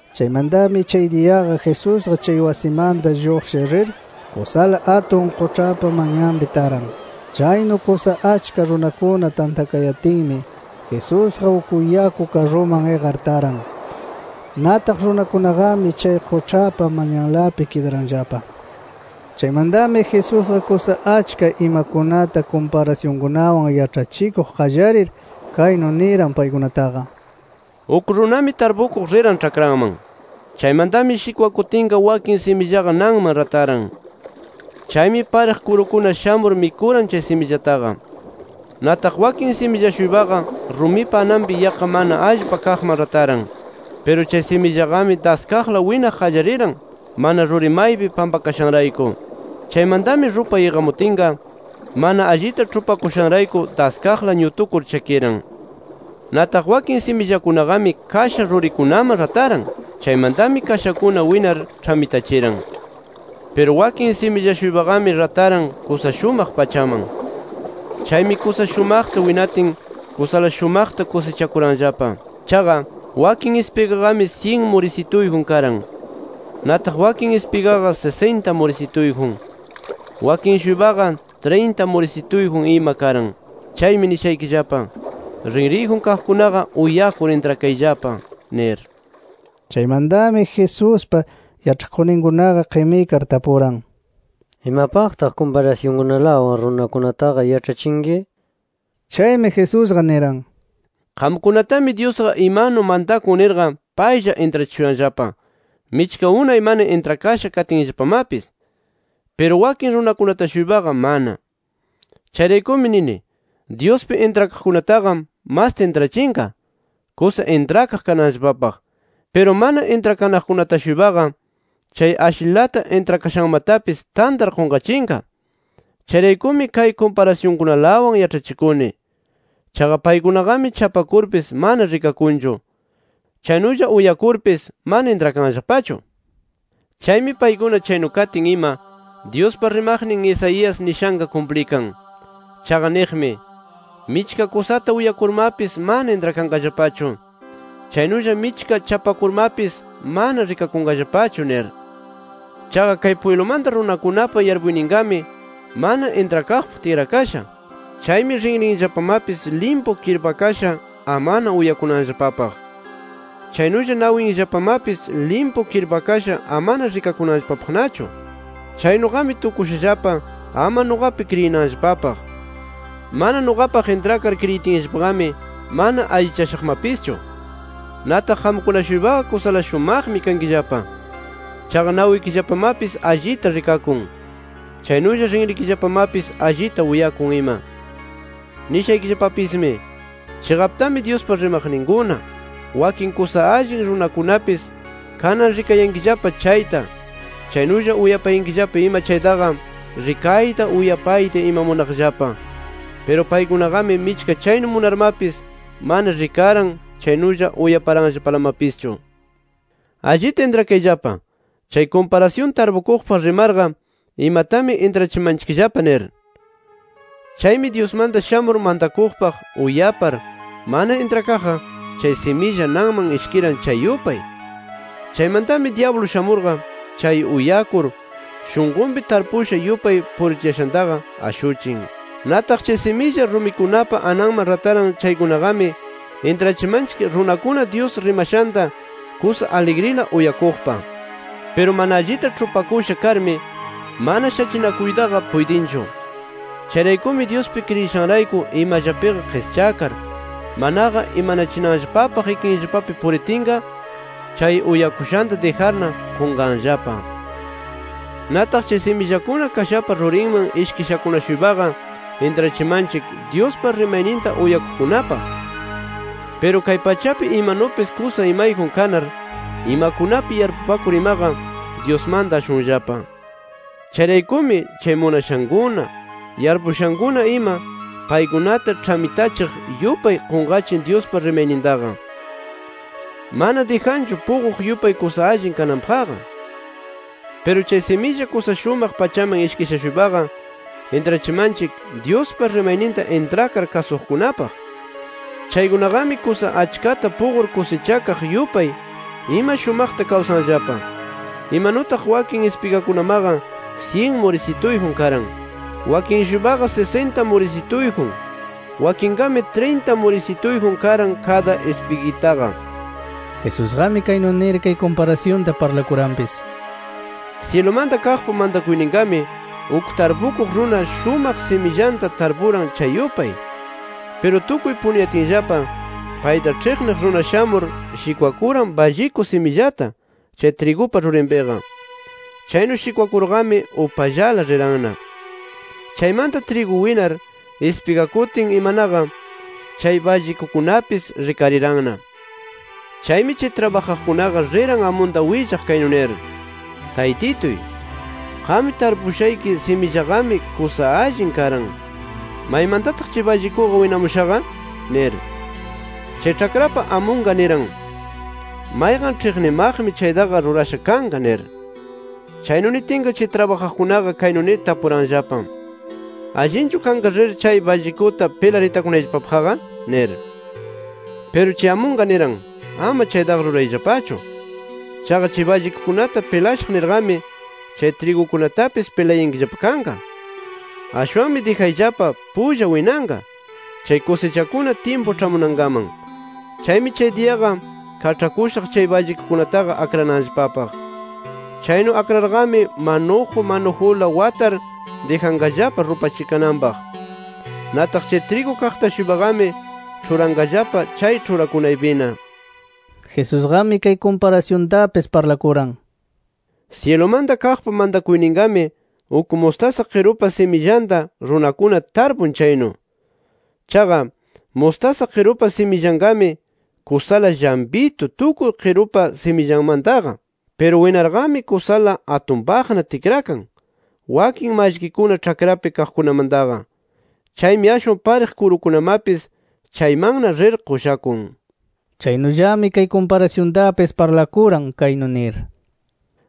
Chaymantami chay diyaqa Jesusqa chay wasimanta lluqshir rir kusala atun quĉhapa manyanpi taran. Chaynu kusa achka runakuna tantakayatinmi, Jesusqa uk yaku karruman iqar taran. Nataq runakunaqami chay quĉhapa manyanlapi kidaranllapa. Chaymantami Jesusqa kusa achka imakunata kumparasyunkunawan yaĉhachikuq qallarir, kaynu niran paykunataqa: “Uk runami tarpukuq riran ĉhakranman. Chaymantami shikwakutinqa wakin simillaqa nanman rataran. Chaymi pariq kurukuna shamur mikuran chay simillataqa. “Nataq wakin similla-shuypaqa rumipa ananpi yaqqa mana allpa kaqman rataran. Piru chay simillaqami daskaqla winaq qallariran, mana ruri maypi pampakashanrayku. Chaymantami rupay iqamutinqa mana allita ĉhupakushanrayku, daskaqla ñutukur chakiran. “Nataq wakin simillakunaqami kasha rurikunaman rataran. Chaymantami kashakuna winar ĉhamitachiran. “Piru wakin similla-shuypaqami rataran kusa shumaq pachaman. Chaymi kusa shumaqta winatin, kusala shumaqta kusichakuranllapa. Chaqa, wakin ispigaqami syin murisituyjun karan. Nataq wakin ispigaqa sisinta murisituyjun. Wakin-shuypaqa, trinta murisituyjun ima karan. Chaymi nishaykillapa: Rinriyjun kaqkunaqa uyakur intrakayllapa nir”. Chaymantami Jesuspa yaĉhakuqninkunaqa qimikar tapuran: —¿Imapaqtaq kumparasyunkunalawan runakunataqa yaĉhachinki? nir. Chaymi Jesusqa niran: “Qamkunatami Dyusqa imanumi mantakun nirqa paylla intrachishuyanllapa, michka unay mana intrakasha katinllapamapis. Piru wakin runakunata-shuypaqa mana. Chayraykumi nini: Dyuspi intrakaqkunataqa masta intrachinqa, kusa intrakaq kananllapapaq. Piru mana intrakanaqkunata-shuypaqa, chay ashlilata intrakashanmatapis tantar qunqachinqa. Chayraykumi kay kumparasyunkunalawan yaĉhachikuni. Chaqa, paykunaqami chapakurpis mana rikakunchu. Chaynulla uyakurpis mana intrakanllapachu. Chaymi paykuna chaynu katin ima, Dyuspa rimaqnin Isaías nishanqa kumplikan. Chaqa niqmi: ‘Michka kusata uyakurmapis, mana intrakanqallapachu. Chaynulla michka chapakurmapis, mana rikakunqallapachu nir. Chaqa kay pwiblumanta runakunapa yarpuyninqami mana intrakaqpaq tikrakasha. Chaymi rinrinllapamapis limpu kirpakasha amana uyakunanllapapaq. Chaynulla nawinllapamapis limpu kirpakasha amana rikakunanllapapaqnachu. Chaynuqami tukushallapa ama nuqapi kriyinanllapapaq. Mana nuqapaq intrakar kriyitinllapaqami, mana allichashaqmapischu’. “Nataq qamkuna-shuypaqa kusala shumaqmi kankillapa. Chaqa nawikillapamapis allita rikakun. Chaynulla rinrikillapamapis allita uyakun ima. Nishaykillapapismi: Chiqaptami Dyuspa rimaqninkuna, wakin kusa allin runakunapis, kanan rikayankillapa chayta, chaynulla uyapayankillapa ima chaytaqa, rikayta uyapayta ima munaqllapa. Piru paykunaqami michka chaynu munarmapis mana rikaran chaynulla uyaparanllapalamapischu. “Allita intrakayllapa, chay kumparasyun tarpukuqpaq rimarqa imatami intrachimanchikllapa nir: Chaymi Dyusmanta shamur mantakuqpaq uyapar mana intrakaqqa, chay similla nanman ishkiran chay yupay. Chaymantami dyablu shamurqa, chay uyakur shunqunpi tarpusha yupay purichiyashantaqa ashuchin. “Nataq chay similla rumikunapa ananman rataran chaykunaqami, intrachimanchik runakuna Dyus rimashanta kusa aligrila uyakuqpaq. Piru mana allita ĉhupakusha karmi, mana shachinakuytaqa puytinchu. Chayraykumi Dyuspi kriyishanrayku imallapiqa qischakar, manaqa imanachinanllapapaq ikinllapapi puritinqa chay uyakushanta dijarna qunqanllapa. “Nataq chay simillakuna kashapa rurinman ishkishakuna-shuypaqa, intrachimanchik Dyuspa rimayninta uyapaqkunapaq. Piru kay pachapi imanupis kusa imayjun kanar, imakunapi yarpupakur imaqa, Dyusmanta ashunllapa. Chayraykumi, chay munashankuna, yarpupakushankuna ima, paykunata ĉhamitachiq yupay qunqachin Dyuspa rimaynintaqa. Mana dijanchu puquq yupay kusa allin kananpaqqa. “Piru chay similla kusa shumaq pachaman ishkisha-shuypaqa intrachimanchik, Dyuspa rimayninta intrakar kasuqkunapaq. Chaykunaqami, kusa achkata puqur kusichakaq yupay ima shumaqta kawsanllapa. Imanutaq wakin ispigakunamaqa, syin murisituyjun karan, wakin-shuypaqa sisinta murisituyjun, wakinqami trinta murisituyjun karan kada ispigitaqa”. Jesusqami kaynu nir kay kumparasyunta parlakuranpis: “Syilumanta kaqpa mantakuyninqami, uk tarpukuq runa shumaq simillanta tarpuran chay yupay. Piru tukuy punuyatinllapa, payta ĉhiqniq runa shamur shikwakuran balliku simillata chay trigupa rurinpiqa. Chaynu shikwakurqami upallala riranna. “Chaymanta trigu winar ispigakutin imanaqa, chay ballikukunapis rikariranna. Chaymi chay trabajaqkunaqa riran amunta willaq, kaynu nir: ‘Taytituy, qam tarpushayki simillaqami kusa allin karan. ¿Maymantataq chay ballikuqa winamushaqa?’ nir. “Chay ĉhakrapa amunqa niran: ‘Mayqan ĉhiqnimaqmi chaytaqa rurasha kanqa’ nir. Chaynu nitinqa chay trabajaqkunaqa kaynu nir tapuranllapa. ‘¿Allinchu kanqa rir chay ballikuta pilar itakunayllapapaqqa?’ nir. “Piru chay amunqa niran: ‘Ama chaytaqa rurayllapachu. Chaqa chay ballikukunata pilashaq nirqami, chay trigukunatapis pilayankillapa kanqa. Ashwanmi dijayllapa pulla winanqa chay kusichakuna tyimpu ĉhamunankaman. Chaymi chay diyaqa kaĉhakushaq chay ballikukunataqa akrananllapapaq. Chaynu akrarqami manuju manujula watar dijanqallapa rupachikananpaq. Nataq chay trigu kaqta-shuypaqami ĉhuranqallapa chay ĉhurakunaypina’”. Jesusqami kay kumparasyuntapis parlakuran: “Syilumanta kaqpa mantakuyninqami uk mustasa qirupa simillanta, runakuna tarpun chaynu. Chaqa, mustasa qirupa simillanqami kusala llampitu tukuy qirupa simillanmantaqa. Piru winarqami, kusala atunpaqna tikrakan, wakin mallkikuna ĉhakrapi kaqkunamantaqa. Chaymi ashwan pariq kuritukunamapis, chaymanna rir qushakun”. Chaynullami kay kumparasyuntapis parlakuran, kaynu nir: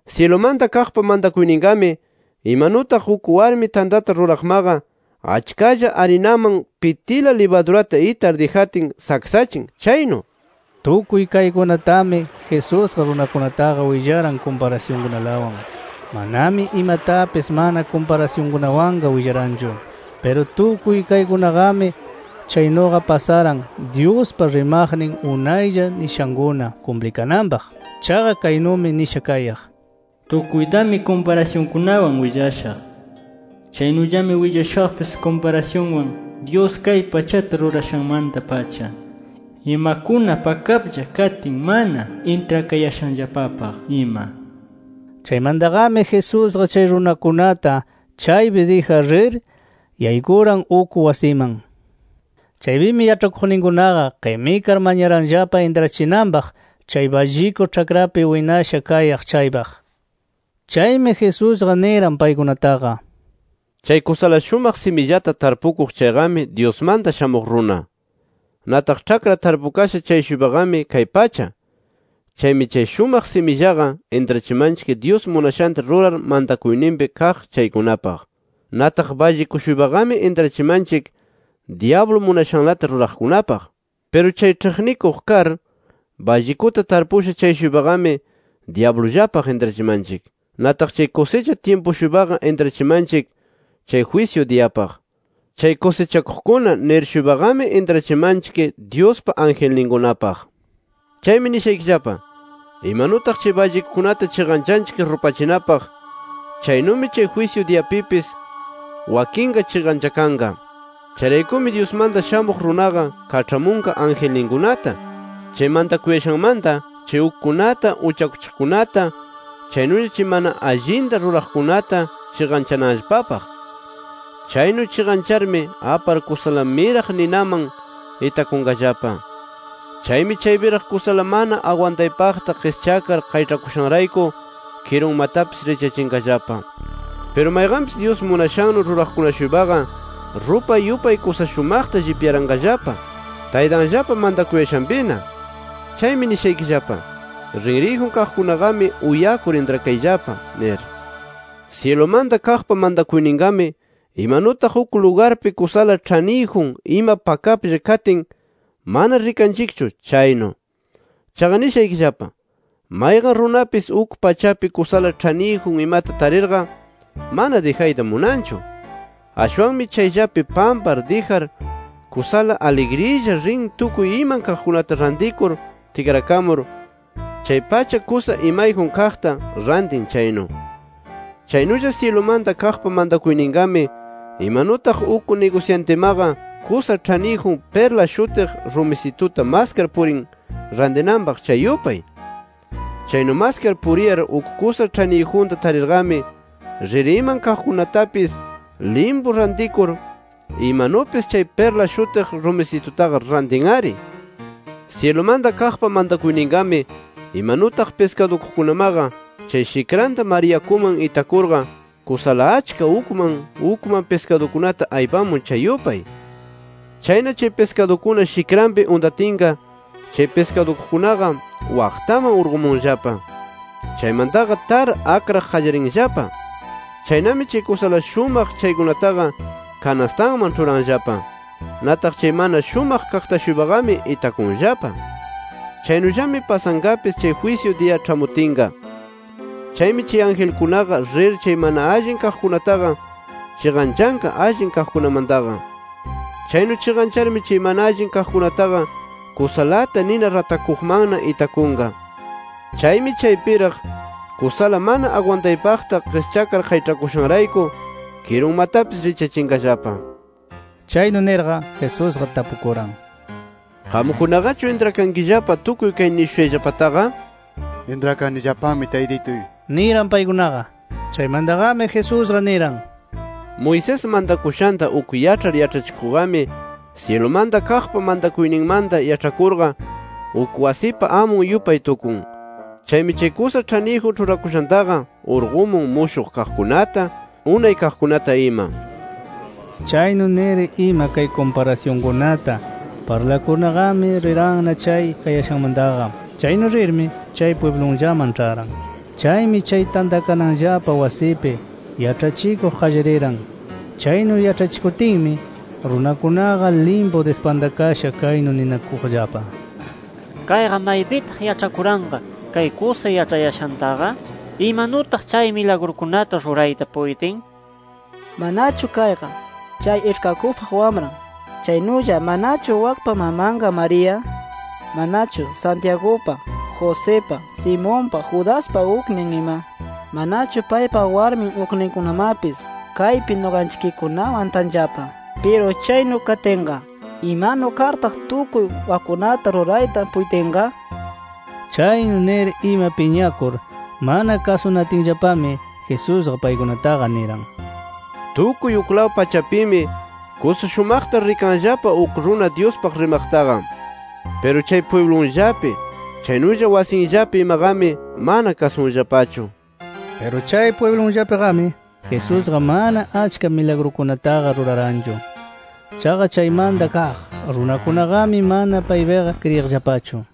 “Syilumanta kaqpa mantakuyninqami imanutaq uk warmi tantata ruraqmaqa, achkalla arinaman pitila libadurata itar dijatin saksachin chaynu”. Tukuy kaykunatami, Jesusqa runakunataqa willaran kumparasyunkunalawan. Manami imatapis mana kumparasyunkunawanqa willaranchu. Piru tukuy kaykunaqami chaynuqa pasaran Dyuspa rimaqnin unaylla nishankuna kumplikananpaq. Chaqa kaynumi nisha kayaq: “Tukuytami kumparasyunkunawan willashaq. Chaynullami willashaqpis kumparasyunwan, Dyus kay pachata rurashanmanta-pacha imakuna pakaplla katin mana intrakayashanllapapaq ima”. Chaymantaqami Jesusqa chay runakunata chaypi dijar rir yaykuran uk wasiman. Chaypimi yaĉhakuqninkunaqa qimikar mañaranllapa intrachinanpaq chay balliku ĉhakrapi winasha kayaq chaypaq. Chaymi Jesusqa niran paykunataqa: “Chay kusala shumaq simillata tarpukuq chayqami Dyusmanta Shamuq Runa. Nataq ĉhakra tarpukasha chay-shuypaqami kay pacha. Chaymi chay shumaq simillaqa intrachimanchik Dyus munashanta rurar mantakuyninpi kaq chaykunapaq. Nataq balliku-shuypaqami intrachimanchik dyablu munashanlata ruraqkunapaq. Piru chay ĉhiqnikuq kar, ballikuta tarpusha chay-shuypaqami dyablullapaq intrachimanchik. Nataq chay kusicha tyimpu-shuypaqa intrachimanchik chay jwisyu diyapaq. Chay kusichakuqkuna nir-shuypaqami intrachimanchik Dyuspa angelninkunapaq. “Chaymi nishaykillapa: Imanutaq chay ballikukunata chiqanchanchik rupachinapaq, chaynumi chay jwisyu diyapipis wakinqa chiqanchakanqa. Chayraykumi Dyusmanta Shamuq Runaqa kaĉhamunqa angelninkunata, chay mantakuyashanmanta chay ukkunata uchakuchiqkunata, chaynulla chay mana allinta ruraqkunata chiqanchananllapapaq. Chaynu chiqancharmi apar kusala miraq ninaman itakunqallapa. Chaymi chaypiraq kusala mana agwantaypaqta qischakar qayĉhakushanrayku kirunmatapis richyachinqallapa. Piru mayqanpis Dyus munashannu ruraqkuna-shuypaqa, rupay yupay kusa shumaqta llipyaranqallapa Taytanllapa mantakuyashanpina. Chaymi nishaykillapa: Rinriyjun kaqkunaqami, uyakur intrakayllapa nir. “Syilumanta kaqpa mantakuyninqami imanutaq uk lugarpi kusala ĉhaniyjun ima pakaplla katin mana rikanchikchu chaynu. Chaqa nishaykillapa: Mayqan runapis uk pachapi kusala ĉhaniyjun imata tarirqa mana dijayta munanchu. Ashwanmi chayllapi pampar dijar kusala aligrilla rin tukuy iman kaqkunata rantikur tikrakamur, chay pacha kusa imayjun kaqta rantin chaynu. “Chaynulla syilumanta kaqpa mantakuyninqami, imanutaq uk nigusyantimaqa kusa ĉhaniyjun pirla shutiq rumisituta maskar purin rantinanpaq, chay yupay. Chaynu maskar puriyar uk kusa ĉhaniyjunta tarirqami, rir iman kaqkunatapis limpu rantikur, imanupis chay pirla shutiq rumisitutaqa rantin-ari. “Syilumanta kaqpa mantakuyninqami imanutaq piskadukuqkunamaqa chay shikranta mar yakuman itakurqa kusala achka ukman ukman piskadukunata aypamun chay yupay. Chayna chay piskadukuna shikranpi untatinqa chay piskadukuqkunaqa waqtaman urqumunllapa. Chaymantaqa tar akraq qallarinllapa. Chaynami chay kusala shumaq chaykunataqa kanastanman ĉhuranllapa. Nataq chay mana shumaq kaqta-shuypaqami itakunllapa. Chaynullami pasanqapis chay jwisyu diya ĉhamutinqa. Chaymi chay angelkunaqa rir chay mana allin kaqkunataqa chiqanchanqa allin kaqkunamantaqa. Chaynu chiqancharmi chay mana allin kaqkunataqa kusalata nina ratakuqmanna itakunqa. Chaymi chaypiraq kusala mana agwantaypaqta qischakar qayĉhakushanrayku kirunmatapis richyachinqallapa”. Chaynu nirqa, Jesusqa tapukuran: —¿Qamkunaqachu intrakankillapa, tukuy kay nishushayllapataqa? —Intrakanillapami Taytituy— niran paykunaqa. Chaymantaqami Jesusqa niran: —Moisés mantakushanta uk yaĉhar yaĉhachikuqqami syilumanta kaqpa mantakuyninmanta yaĉhakurqa, uk wasipa amun yupay tukun. Chaymi chay kusa ĉhaniyjun ĉhurakushantaqa urqumun mushuq kaqkunata, unay kaqkunata ima. Chaynu nir ima kay kumparasyunkunata parlakurnaqami riranna chay kayashanmantaqa. Chaynu rirmi chay pwiblunllaman ĉharan. Chaymi chay tantakananllapa wasipi yaĉhachikuq qallariran. Chaynu yaĉhachikutinmi runakunaqa limpu dispantakasha kaynu ninakuqllapa: “¿Kayqa maypitaq yaĉhakuranqa kay kusa yaĉhayashantaqa? ¿Imanutaq chay milagrukunata rurayta puytin? ¿Manachu kayqa, chay iĉhkakuqpa wamran? ¿Chaynulla manachu wakpa mamanqa María? ¿Manachu Santiagupa, Josipa, Simonpa, Judaspa uknin ima? ¿Manachu paypa warmi ukninkunamapis kaypi nuqanchikkunawan tanllapa? ¿Piru chaynu katinqa, imanu kartaq tukuy wakkunata rurayta puytinqa?” nir. Chaynu nir ima piñakur mana kasunatinllapami, Jesusqa paykunataqa niran: “Tukuy uklaw pachapimi kusa shumaqta rikanllapa uk runa Dyuspaq rimaqtaqa. Piru chay pwiblunllapi chaynulla wasinllapi imaqami mana kasunllapachu” nir. Piru chay pwiblunllapiqami Jesusqa mana achka milagrukunataqa ruraranchu. Chaqa chaymanta kaq runakunaqami mana paypiqa kriyiqllapachu.